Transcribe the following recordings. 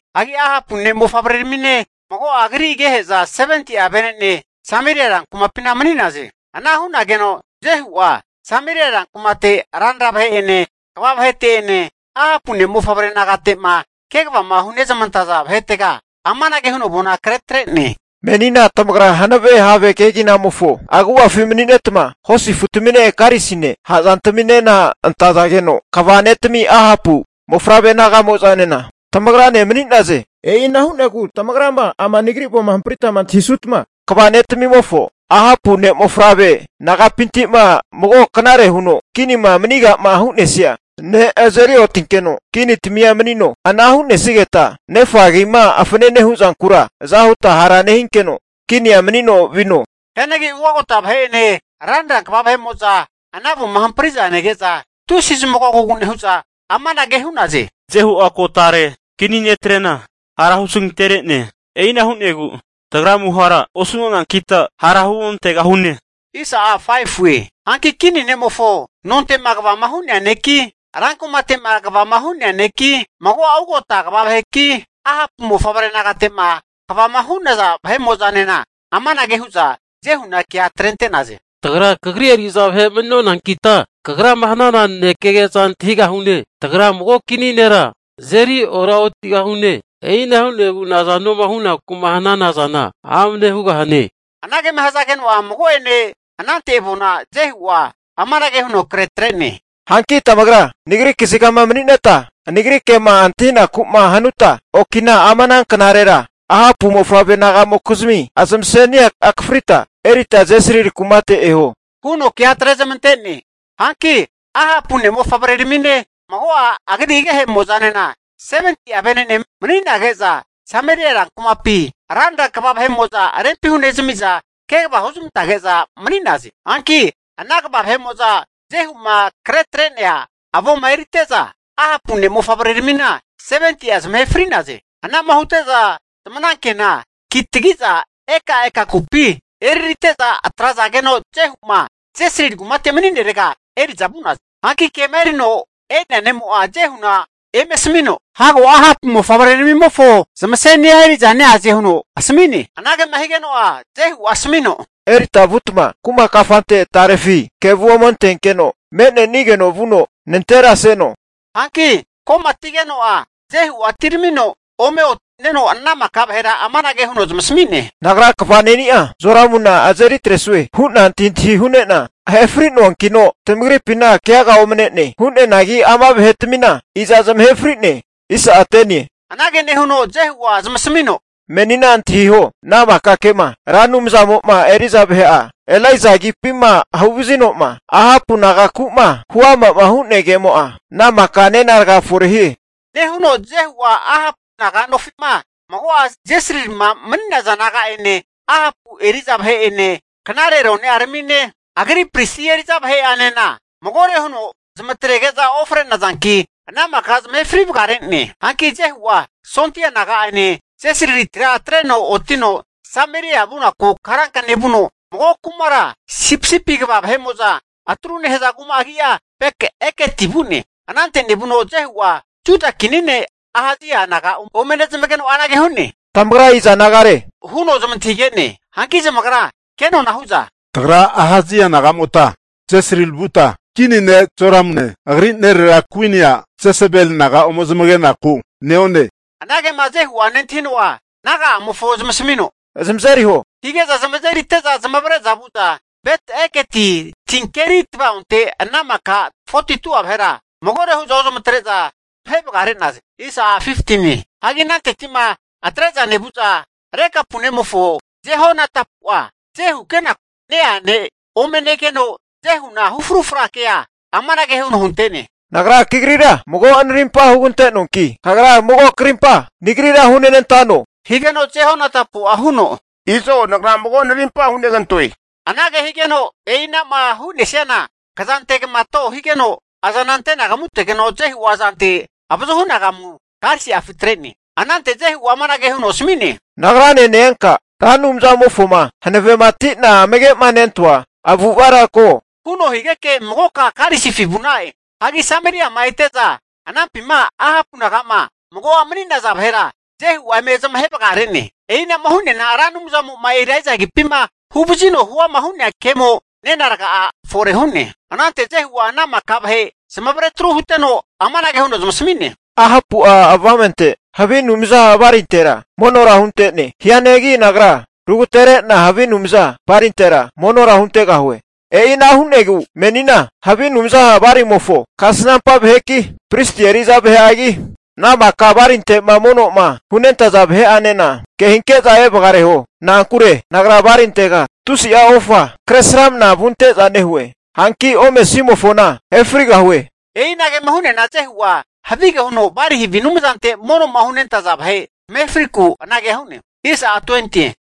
Hanki Ahapu ne'mofavreramine, mago'a agri agehe'za 70'a venene Sameria rankumapina mani'naze. Ana hu'nageno Jehu'a, Sameria rankumate ranra vahe'ene, kva vahete'ene, Ahapu ne'mofavre nagate'ma kegavama hunezmante'za vahetega amanage huno avona kretre'ne. Menina tamagra hanave have kegina agu'afi mani'netma, hosi afutamine karisine, ha'zantaminena antazageno, kva ne'tami Ahapu ne'mofavre naga'mo'zanena tamagra mani'naze. E'ina hu'negu tamagrama ama nagri avoma hamprita antahisutma, kva ne'tmimofo Ahapu ne'mofavre naga'pinti'ma mago knare huno kinima maniga'ma hu'nesia ne' azeri otinkeno kinitamia manino. Ana hu'nesigeta nefa agima fanane hu'zankura, aza huta hara nehinkeno kinia manino vino. Hianagi ugagota vahe'ene, ranra kva vahemo'zanena ana avoma hampri'za nege'za tusi zamagogogu nehu'za, amanage hu'za hu'naze, Jehu'a ko tare kini netre'na hara hu zanagatere'ne. E'ina hu'negu tagra amuhara osu'nonankita, hara huontegahune. Hanki kini ne'mofo nonte'ma kvama hu'nea neki, rankumate'ma kvama hu'nea neki, mago'a ugota kva vaheki, Ahapu mofavre nagate'ma kvama hu'naza vahe'mo'zanena amanage hu'za Jehuna kea atrente'naze. Tagra kagri eri'za vahe mani'nonankita kagrama hana nanekege'za antahigahune. Tagra mago kini nera azeri oraotigahune. E'ina hu'negu nazanoma huku'ma hananazana amne hugahane. Anagema hazageno'a, mago'ene anante avona Jehu'a amanage huno kretre'ne. Hanki tamagrama nagri kazigama mani'neta nagri kema antahinaku'ma hanuta, okina ama ananknare Ahapu mofavre nagamokizmi zamasenia akafrita erita Jesrili kumate eho, huno kea atrezmante'ne. Hanki Ahapu ne'mofavre'ramine, mago'a agri agehe'mozanena 70'a venene mani'nage'za, Sameria rankumapi ranra kva vahe'mo'za rempi hunezmi'za kegava huzmantage'za mani'naze. Hanki ana kva vahe'mo'za Jehu'ma kretre'nea avoma erite'za, Ahapu ne'mofavreramina 70'a zamahe fri'naze. Anama hute'za zamanankena kitagiza ekaeka kutamimpi eririte'za atrazage'za Jehu'ma Jesrili kumate mani'nerega eri'za vu'naze. Hanki kema erino e'nea ne'mo'a Jehuna eme asamino, hago Ahapu ne'mofavre'ramimofo zamasenia eri'za neaze huno asmi'ne. Anagema higeno'a, Jehu'a asamino, erita vutma kuma kafante tarefi kevu ome antenkeno me'nenigeno vuno nanteraseno hu'ne. Hanki ko'matigeno'a Jehu'a atiramino ome oti'neno, ana maka vahera amanage huno zamasami'ne, nagra kva ne'ni'a Joramuna azeri atresue hu'na antahintahi hu'ne'na ahe fri'noankino, tamagripina keaga omne'ne. Hu'neanagi ama vahetamina iza zamahe fri'ne? Anage nehuno Jehu'a zamasamino, Menina antahiho ana maka kema Ra Anumzamo'ma eri'za vahe'a Elaija agipima huvazino'ma Ahapu nagaku'ma huama'ma hu'nea kemo'a, ana maka nena raga fore hie. Nehuno Jehu'a Ahapu naga'nofima mago'a Jesrilima mani'naza naga'ene, Ahapu eri'za vahe'ene, knare rone'aramine, agri pristi eri'za vahe'anena, magore huno zamatrege'za ofre'nazanki, ana maka zamahe fri vagare'ne. Hanki Jehu'a sondia naga'ane Jesrilitira atreno otino Sameria vunaku karanka nevuno, mago kumara sipisipi kva vahe'mo'za atru nehaza kuma agi'a, Bet-Eketi vu'ne. Anante nevuno Jehu'a Juda kini ne' Ahazia naga ome nezamageno anage hu'ne, tamagra iza nagare, huno zamantahige'ne. Hanki zamagra kenona'a hu'za, tagra Ahazia nagamota Jesrili vuta kini ne' Joramune, agri nerera kuini a' Jesebeli naga ome zamagenaku neone. Anagema Jehu'a nentahino'a naga'amofo zamasamino, zamazeriho hige'za zamazerite'za zamavare'za vu'za Bet-Eketi tinkeri tva'onte ana maka 42'a vahera magore hu'za ozmatre'za zamahe vagare'naze. Hagi ananteti'ma atre'za nevu'za, Rekabu nemofo Jehonadabu'a Jehu keku ne-ea ne' ome negeno, Jehu'a hu frufra kea amanage huno hunte'ne. Nagra kagrira mago narimpa hugante'noanki, kagra mago krimpa nagrira hunenantano? Higeno Jehonadabu'a huno, Izo nagra mago narimpa hunegantoe. Anage higeno e'inama hu'nesiana kza ante'nagamato higeno, azana ante anagamutegeno Jehu'a azante avazuhu anagama karisi'afi atre'ne. Anante Jehu'a amanage huno asami'ne, Nagrane ne-enka Ra Anumzamofoma hanavematina amage'manentoa avu'avara ko, huno higeke, magoka karisifi vu'na'e. Hagi Sameriama ete'za, anampima Ahapu naga'ma mago'a mani'naza vahera Jehu'a eme zamahe vagare'ne. E'inama hu'neana Ra Anumzamo eri'za ne'a Elaija agipima huvazino huama hu'nea kemo nena raga'a fore hu'ne. Anante Jehu'a ana maka vahe zamavare atru huteno amanage huno zamasami'ne, Ahapu'a avamente havi anumza Balintera monora hunte'ne. Hianagi nagra rugatere'na havi anumza Balintera monora huntegahue. E'ina hu'negu menina havi anumza Balimofo kasnampa vaheki, pristi eri'za vahe'agi, ana maka Balinte'ma mono'ma hunentaza vahe'enena kehinke'za evagareho. Na'ankure nagra Balintega tusi'a ofa kresramna vunte'za nehue. Hanki omesimofona ahe frigahue. E'inagema hu'neana Jehu'a havige huno Bali havi anumzante mono'ma hunentaza vahe zamahe friku anagea hu'ne.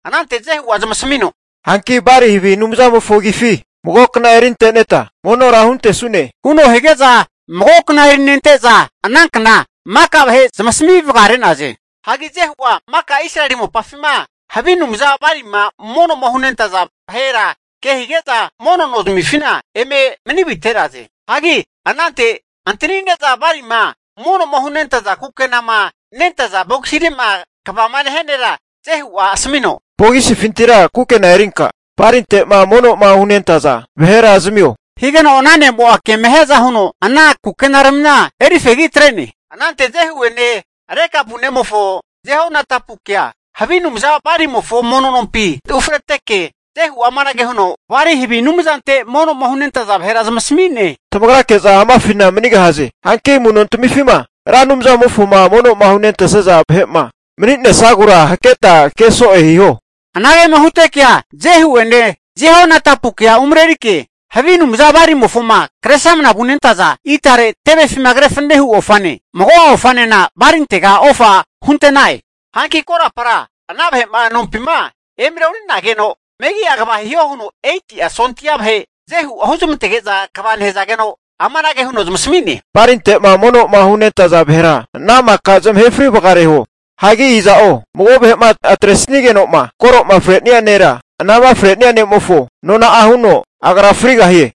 Anante Jehu'a zamasamino, Hanki Bali havi anumzamofo agifi mago kna erinteta monora huntesune, huno hige'za mago kna erintete'za ana knagura maka vahe zamasami vagare'naze. Hagi Jehu'a maka Israeli mopafima havi anumza Balima mono hunentaza vahera ke hige'za, mono no zmifina eme mani avite'naze. Hagi anante antanine'za Balima mono'ma hunentaza kukenama nentaza bogisire'ma kvama nehia nera Jehu'a asamino, Bogisifintira kukena erinka Balinte'ma mono'ma hunentaza vahera zamio, higeno ana ne'mo'a kema hiaza huno ana kukenaramina eri fegi atre'ne. Anante Jehu'ene Rekabu nemofo Jehonadabukea ana havi anumza Balimofo mono nompi ufreteke, Jehu'a amanage huno Bali havi anumzante mono'ma hunentaza vahera zamasami'ne. Tamagrake'za amafina manigahaze. Hanki amu'nontamifima Ra Anumzamofoma mono'ma hunentesaza vahe'ma mani'nesagura haketa ke so'e hiho. Anagema hutekea Jehu'ene Jehonadabukea umrerike havi anumza Balimofoma kresramnama vunentaza itare tevefima kre fanenehu ofane, mago'a ofanena Balintega ofa hunte'na'e. Hanki korapara ana vahe'ma nompima emareorinageno, megi'a kva hiho huno, 80'a sondia vahe Jehu'a huzamantege'za kva nehazageno, amanage huno zamasami'ne, Balinte'ma mono'ma hunentaza vahera ana maka zamahe fri vagareho. Hagi iza'o mago vahe'ma atresigeno'ma koro fre'nia nera, anama fre'nia ne'mofo nona'a huno agra frigahie.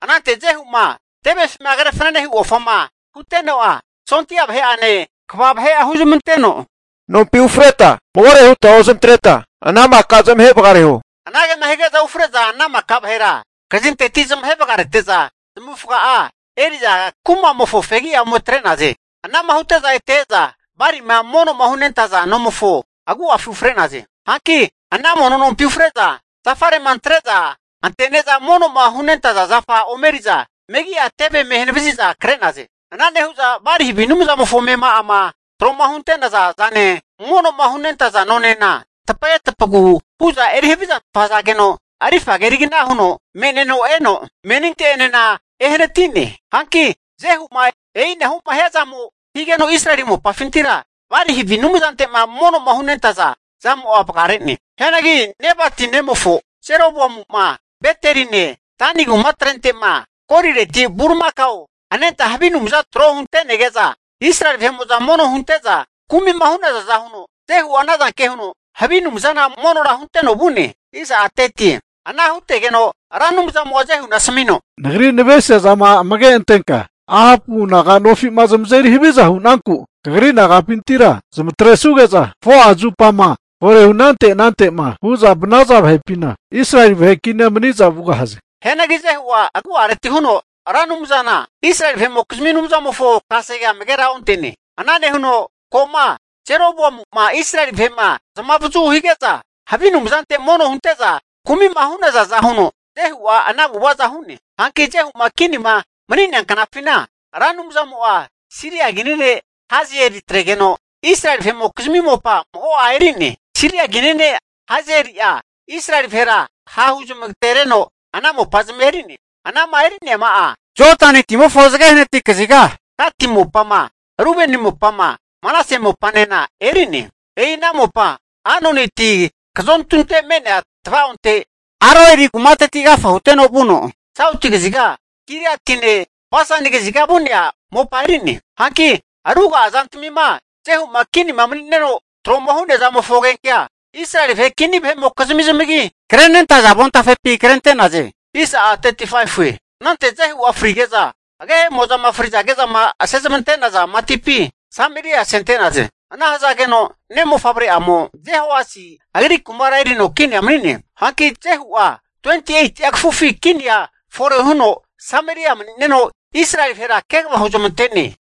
Anante Jehu'ma tevefima kre fanenehu ofama huteno'a, sondia vahe'ane kva vahe'anena huzamanteno, nompi ufreta magore huta ozamatreta ana maka zamahe vagareho. Anagema hige'za ufre'za ana maka vahera kazinteti zamahe vagarete'za, zamavufaga'a eri'za kumamofo fegi'a ome atre'naze. Anama hute'za ete e'za Balima mono hunentaza nomofo agu'afi ufre'naze. Hanki ana mono nompi ufre'za, zafare'ma antre'za antene'za mono'ma hunentaza zafa ome eri'za, megi'a teve eme hanavazi'za kre'naze. Ana nehu'za Bali havi anumzamofo amema'ama tro'ma hunte'naza zane, mono'ma hunentaza nonena tapage tapagu huza eri havizantfa hazageno, rifa kerigna huno me'neno eno meninte'enena ehanati'ne. Hanki Jehu'ma e'inama hiazamo higeno, Israeli mopafintira Bali havi anumzante'ma mono'ma hunentaza zamo'a vagare'ne. Hianagi Nebati nemofo Jeroboamu'ma Beteline Dani kumatrente'ma, golireti bulimakao anentatrena havi anumzama tro huntege'za Israeli vahe'mo'za mono hunte'za kumi hu'nazaza huno, Jehu'a anazanke huno havi anumzana monora hunteno vu'ne. Ana hutegeno Ra Anumzamo'a Jehuna asmino, Nagri navesiza'ma amage antenka Ahapu naganofi'ma zamazeri haviza hu'nanku, kagri nagapintira zamatresuge'za 4'a zupama fore hu anante ante'ma hu'za vanaza vahepina Israeli vahe kinia maniza vugahaze. Hianagi Jehu'a agu'aretira huno, Ra Anumzana Israeli vahe'mokizmi Anumzamofo kasegea amagera onte'ne. Ana nehuno ko'ma Jeroboamu'ma Israeli vahe'ma zamavazu hige'za havi anumzante mono hunte'za kumi'ma hu'nazaza huno, Jehu'a ana avu'avaza hu'ne. Hanki Jehu'ma kinima mani'nea knafina, Ra Anumzamo'a Siria kini ne' Hazaeli atregeno Israeli vahe'mokizmi mopa mago'a eri'ne. Siria kini ne' Hazaeli'a Israeli vahera ha'huzmagatereno, ana mopazamia eri'ne. Anama eri'neama'a, Jodani timofo zage hanati kaziga, Gati mopama, Rubeni mopama, Manase mopanena eri'ne. E'ina mopa Anoni ti kazontu me'nea tva'onte, Aroeri kumateti agafa huteno vuno, sauti kaziga Giliatine Basani kaziga vu'nea mopa eri'ne. Hanki ruga'a zantamima Jehu'ma kini mani'neno tro'ma hu'nea zamofo agenkea, Israeli vahe kini vahe'mokizmi zamagi zamagenkema krenentaza avontafepi krente'naze. Anante Jehu'a frige'za, agehemo'zama frizagezama asezmante'naza matipi Sameria asente'naze. Ana hazageno ne' mofavre'amo, Jehoahazi agri kumara erino kinia mani'ne. Hanki Jehu'a 28'a kafufi kinia fore huno Sameria mani'neno, Israeli vahera kegava huzmante'ne.